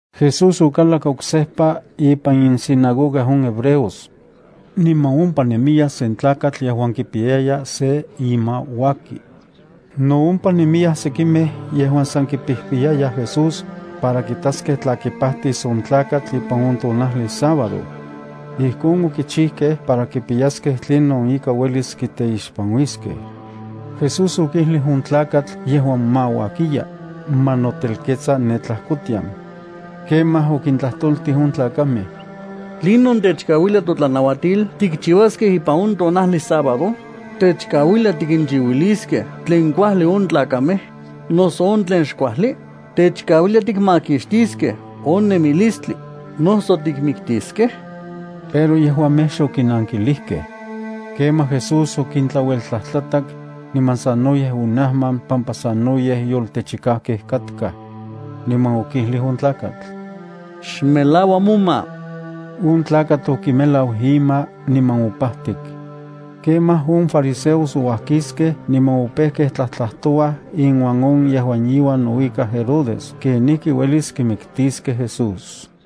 Jesús okalak oksejpa ipan insinagoga on hebreos. Niman ompa nemiya sen tlakatl yejuan kipiyaya se ima uaki. No ompa nemiyaj sekimej yejuan sa kipijpiyayaj Jesús, para kitaskej tla kipajtis on tlakatl ipan on tonajli sábado. Ijkon okichijkej para kipiyaskej tlinon ika uelis kiteixpanuiskej. Jesús okijlij on tlakatl yejuan mauakiya, ma notelketsa ne tlajkotian. Kemaj okintlajtoltij on tlakamej: —¿Tlinon techkauilia totlanauatil tikchiuaskej ipan on tonajli sábado? ¿Techkauilia tikinchiuiliskej tlen kuajli on tlakamej, noso on tlen xkuajli? ¿Techkauilia tikmakixtiskej on nemilistli, noso tikmiktiskej? Pero yejuamej xokinankilijkej. Kemaj Jesús okintlaueltlajtlatak, niman sanoyej onajman pampa sanoyej yoltechikajkej katkaj. Niman okijlij on tlakatl: —Xmelaua moma. On tlakatl okimelau ima niman opajtik. Kemaj, on fariseos ouajkiskej niman opejkej tlajtlajtouaj inuan on yejuan iuan nouikaj Herodes kenijki ueliskej kimiktiskej Jesús.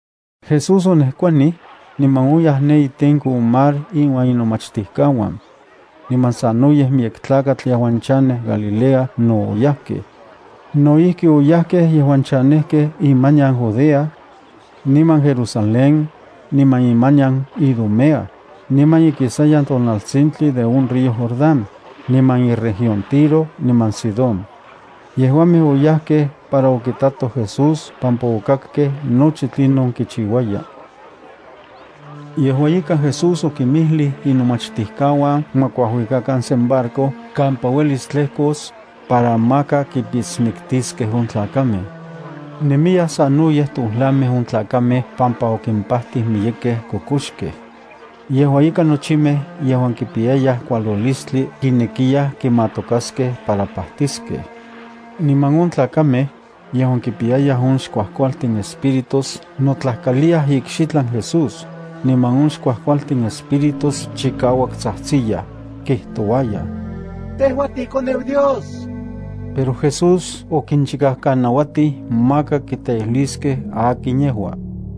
Jesús onejkuanij, niman oyaj ne itenko on mar inuan inomachtijkauan. Niman sanoyej miyek tlakatl yejuan chanej Galilea no oyajkej. No ijki oyajkej yejuan chanejkej imanian Judea, niman Jerusalén, niman imanian Idumea, niman ikisayan tonaltsintli de on río Jordán, niman iregión Tiro niman Sidón. Yejuamej oyajkej para okitatoj Jesús pampa okakkej nochi tlinon kichiuaya. Yejua ika Jesús okinmijlij inomachtijkauan ma kuajuikakan sen barco kampa uelis tlejkos, para maka kipitsmiktiskej on tlakamej. Nemiyaj sanoyej tojlamej on tlakamej pampa okimpajtij miyekej kokoxkej. Yejua ika nochimej yejuan kipiyayaj kualolistli kinekiyaj kimatokaskej para pajtiskej. Niman on tlakamej, yejuan kipiyayaj on xkuajkualtin espíritus notlajkaliyaj ikxitlan Jesús, niman on xkuajkualtin espíritus chikauak tsajtsiyaj, kijtouayaj: —Tejua tiiKoneu Dios. Pero Jesús okinchikajkanauatij maka kiteijliskej akin yejua.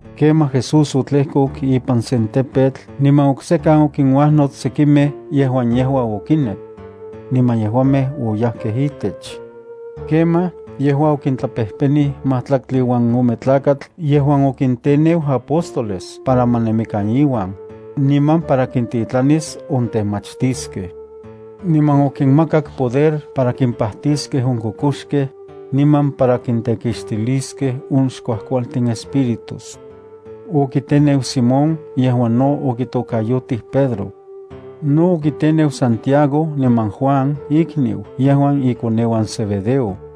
Kemaj Jesús otlejkok ipan sen tepetl niman oksejkan okinuajnots sekimej yejuamej yejua okinek. Niman yejuamej oyajkej itech. Kemaj, yejua okitlapejpenij majtlaktli uan ome tlakatl yejuan okinteneu apóstoles para ma nemikan iuan, niman para kintitlanis ontemachtiskej. Niman okinmakak poder para kimpajtiskej on kokoxkej, niman para kintekixtiliskej on xkuajkualtin espíritus. Okiteneu Simón yejuan no okitokayotij Pedro. No okiteneu Santiago niman Juan ikniu yejuan ikoneuan Zebedeo.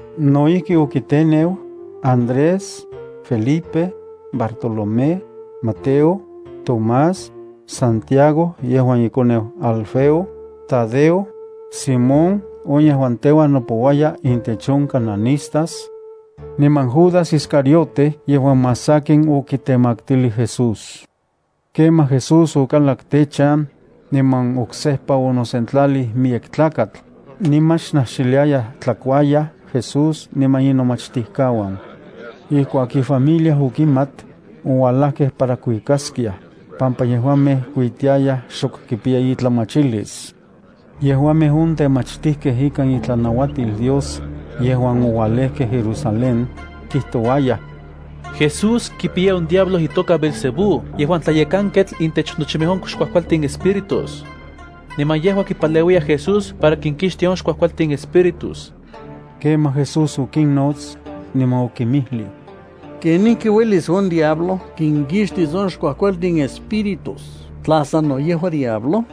No ijki okiteneu: Andrés, Felipe, Bartolomé, Mateo, Tomás, Santiago yejuan ikoneu Alfeo, Tadeo, Simón on yejuan teuan nopouaya intech on cananistas, niman Judas Iscariote yejuan más sakin okitemaktilij Jesús. Kemaj Jesús okalak techan, niman oksejpa onosentlalij miyek tlakatl, niman xnajxiliayaj tlakuayaj Jesús niman inomachtijkauan. Ijkuak ifamilia okimat, oualajkej para kuikaskiaj, pampa yejuamej kuitiayaj xok kipiya itlamachilis. Yejuamej on temachtijkej ikan itlanauatil Dios, yejuan oualejkej Jerusalén, kijtouayaj: —Jesús kipiya on diablo itoka Beelzebú yejuan tlayekanketl intech nochimej on xkuajkualtin espíritus. Niman yejua kipaleuiyaj Jesús para kinkixtia on xkuajkualtin espíritus. Kemaj Jesús okinnots, niman okinmijlij: —¿Kenijki uelis on diablo kinkixtis on xkuajkualtin espíritus tla sano yejua diablo?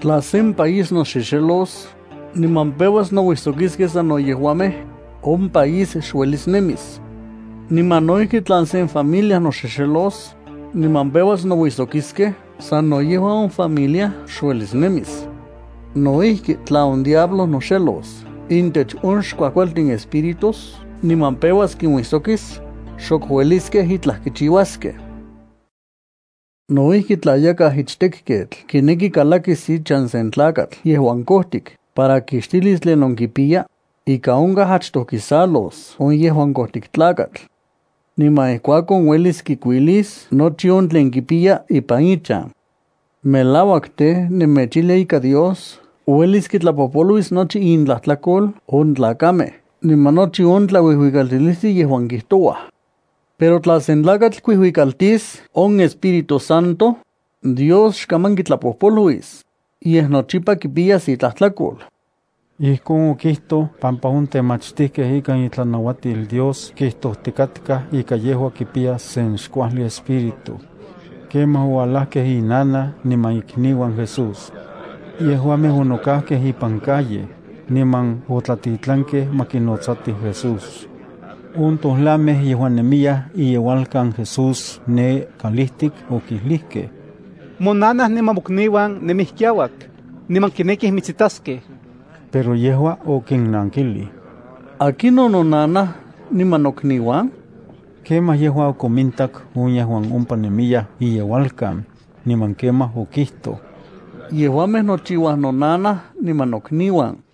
Tla sen país noxexelos, niman peuas nouijsokiskej sano yejuamej, on país xuelis nemis. Niman no ijki, tla sen familia noxexelos, niman peuas nouijsokiskej sano yejua, on familia xuelis nemis. No ijki, tla on diablo noxelos intech on xkuajkualtin espíritus niman peuas kinuijsokis, xok ueliskej itlaj kichiuaskej. ’No ijki, tla yakaj ichtekketl kineki kalakis ichan sen tlakatl yejuan kojtik para kixtilis tlinon kipiya, ika onkaj achtoj kisalos on yejuan kojtik tlakatl. Niman ijkuakon uelis kikuilis nochi on tlen kipiya ipan ichan. ’Melauak tej, nemechijlia ika Dios uelis kitlapojpoluis nochi intlajtlakol on tlakamej niman nochi on tlauijuikaltilistli yejuan kijtouaj. Pero tla sen tlakatl kuijuikaltis on Espíritu Santo, Dios xkaman kitlapojpoluis, yej nochipa kipiyas itlajtlakol. Ijkon okijtoj pampa on temachtijkej ikan itlanauatil Dios kijtojtikatkaj ika yejua kipiya sen xkuajli espíritu. Kemaj oualajkej inanaj niman ikniuan Jesús. Yejuamej onokajkej ipan calle, niman otlatitlankej ma kinotsatij Jesús. On tojlamej yejuan nemiyaj iyeualkan Jesús ne kalijtik, okijlijkej: —Monanaj niman mokniuan nemij kiauak, niman kinekij mitsitaskej. Pero yejua okinnankilij: —¿Akinon nonanaj niman nokniuan? Kemaj yejua okomintak on yejuan ompa nemiyaj iyeualkan, niman kemaj okijtoj: —Yejuamej nochiuaj nonanaj niman nokniuan.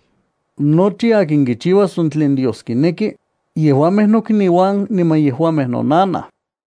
Nochi akin kichiuas on tlen Dios kineki, yejuamej nokniuan, niman yejua nonanaj.